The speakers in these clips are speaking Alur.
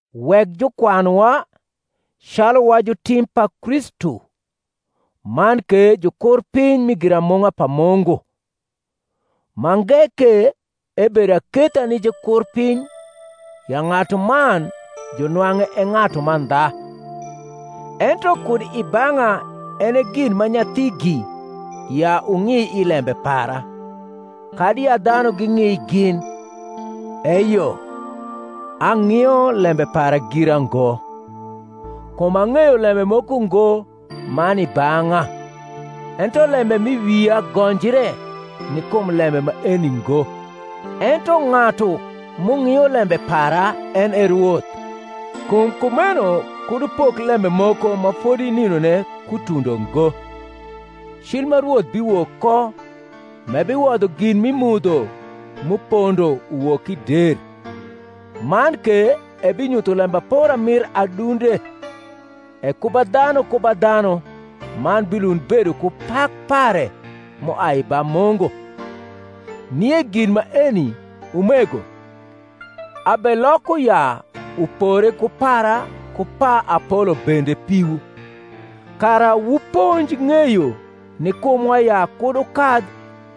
Wek jukwanwa, calu wa jutim pa Kristu, man ke jukurpiny mi giramung’a pa Mungu. Mange ke, ebedo aketha ni jukurpiny ya ng’atuman junwang’e e ng’atu mandha. Ento kud i bang’a en e gin ma nyathigi ya wung’i i lembe para, kadi ya dhanu ging’i gin: eyo, ang’io lembe para gira ngo. Kum ang’eyo lembe moko ngo ma ni i bang’a; ento lembe m’i wia gonjre ni kum lembe maeni ngo: ento ng’atu m’ung’io lembe para en e Rwoth. Kum kumeno kud wupok lembe moko ma fodi nindone kutundo ngo, cil ma Rwoth biwok ko, m’ebiwodho gin m’i mudho m’upondo uwok i der, man ke ebinyutho lembapora mir adunde; e ku ba dhanu ku ba dhanu man bilund bedo ku pak pare m’uai ba Mungu. Nie gin maeni, umego, abeloko ya upore ku para ku pa Apolo bende piwu; kara wuponj ng’eyo ni kumwa ya kud wukadh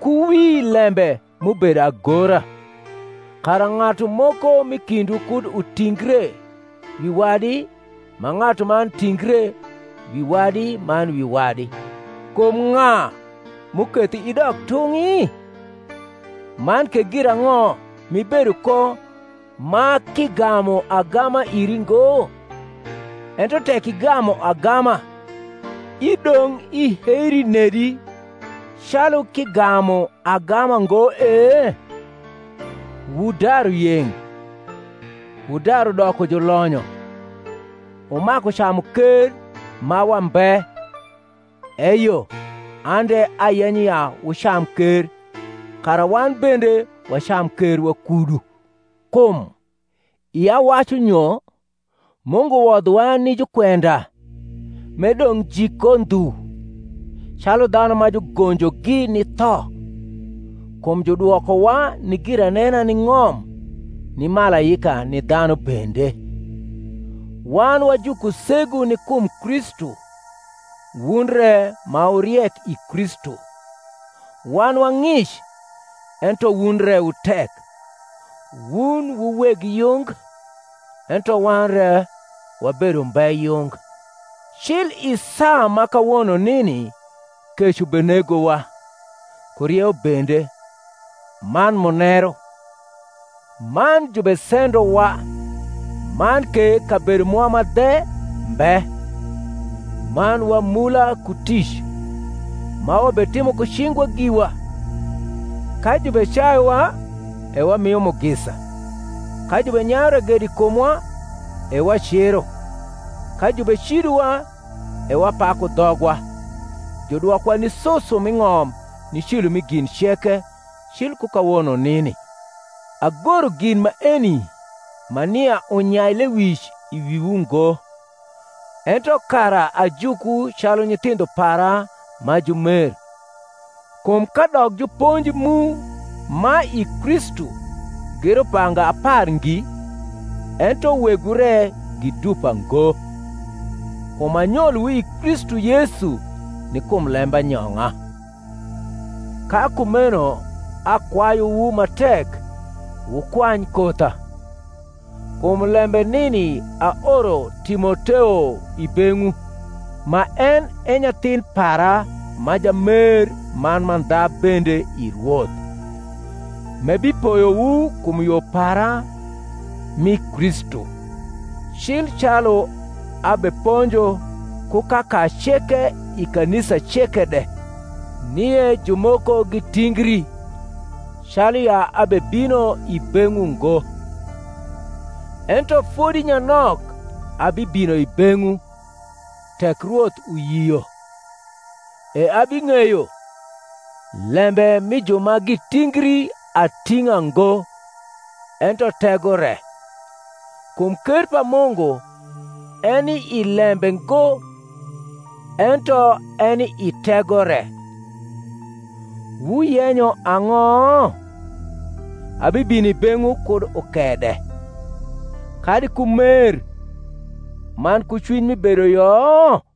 ku wi lembe m’ubedo agora; kara ng’atu moko m’i kindwu kud utingre wi wadi ma ng’atuman tingre wi wadi man wi wadi. Kum ng’a m’uketho idok tung’i? man ke girang’o m’ibedo ko ma k’igamu agama iri ngo? ento tek igamu agama, idong’ iheri nedi calu k’igamu agama ngo e? Wudaru yeng’, wudaru doko julonyo, wumaku camu ker ma wambe: eyo an de ayenyo ya wucam ker, kara wan bende wacam ker wakudu. Kum, ia wacu nyo, Mungu wodhowa ni jukwenda m’e dong’ jik ko ndhu, calu dhanu ma jugonjogi ni tho: kum judwokowa ni giranena ni ng’om, ni malaika ni dhanu bende. Wan wa jukusegu ni kum Kristu, wun re ma wu riek i Kristu; wan wa ng’ic, ento wun re wu tek; wun wu weg yung, ento wan re wabedo umbe yung. Cil i saa ma kawono nini kec ubenegowa, ku rieu bende, man muneru, man jubesendowa, man ke kabedo mwa ma dhe mbe; man wamula ku tic, ma wabetimo ku cingwa giwa: ka jubecayuwa, e wamio mugisa; ka jubenyayu ragedo i kumwa, e waciro; ka jubecidowa, e wapaku dhogwa: judwokowa ni susu m’i ng’om ni cilo mi gin ceke, cil ku kawono nini. Agoro gin maeni ma nia unyai lewic i wiwu ngo, ento kara ajukwu calu nyithindho para ma jumer. Kum kadok juponji mu ma i Kristu gi rubanga apar ngi, ento wegwu re gi dupa ngo; kum anyolowu i Kristu Yesu ni kum lembanyong’a. Ka kumeno akwayuwu ma tek, wukwany kotha. Kum lembe nini aoro Timoteo i beng’wu, ma en e nyathin para ma jamer man mandha bende i Rwoth, m’ebipoyowu kum yo para m’i Kristu, cil calu abeponjo ku kaka ceke i kanisa ceke de. Nie jumoko gitingri, calu ya abebino i beng’wu ngo. Ento fodi nyanok abibino i beng’wu, tek Rwoth uyio; e abing’eyo, lembe mi ju ma gitingri ating’a ngo, ento tego re. Kum ker pa Mungu eni i lembe ngo, ento eni i tego re. Wuyenyo ang’o? abibino i beng’wu kud ukede, kadi ku mer man ku cwiny mi bedoyo?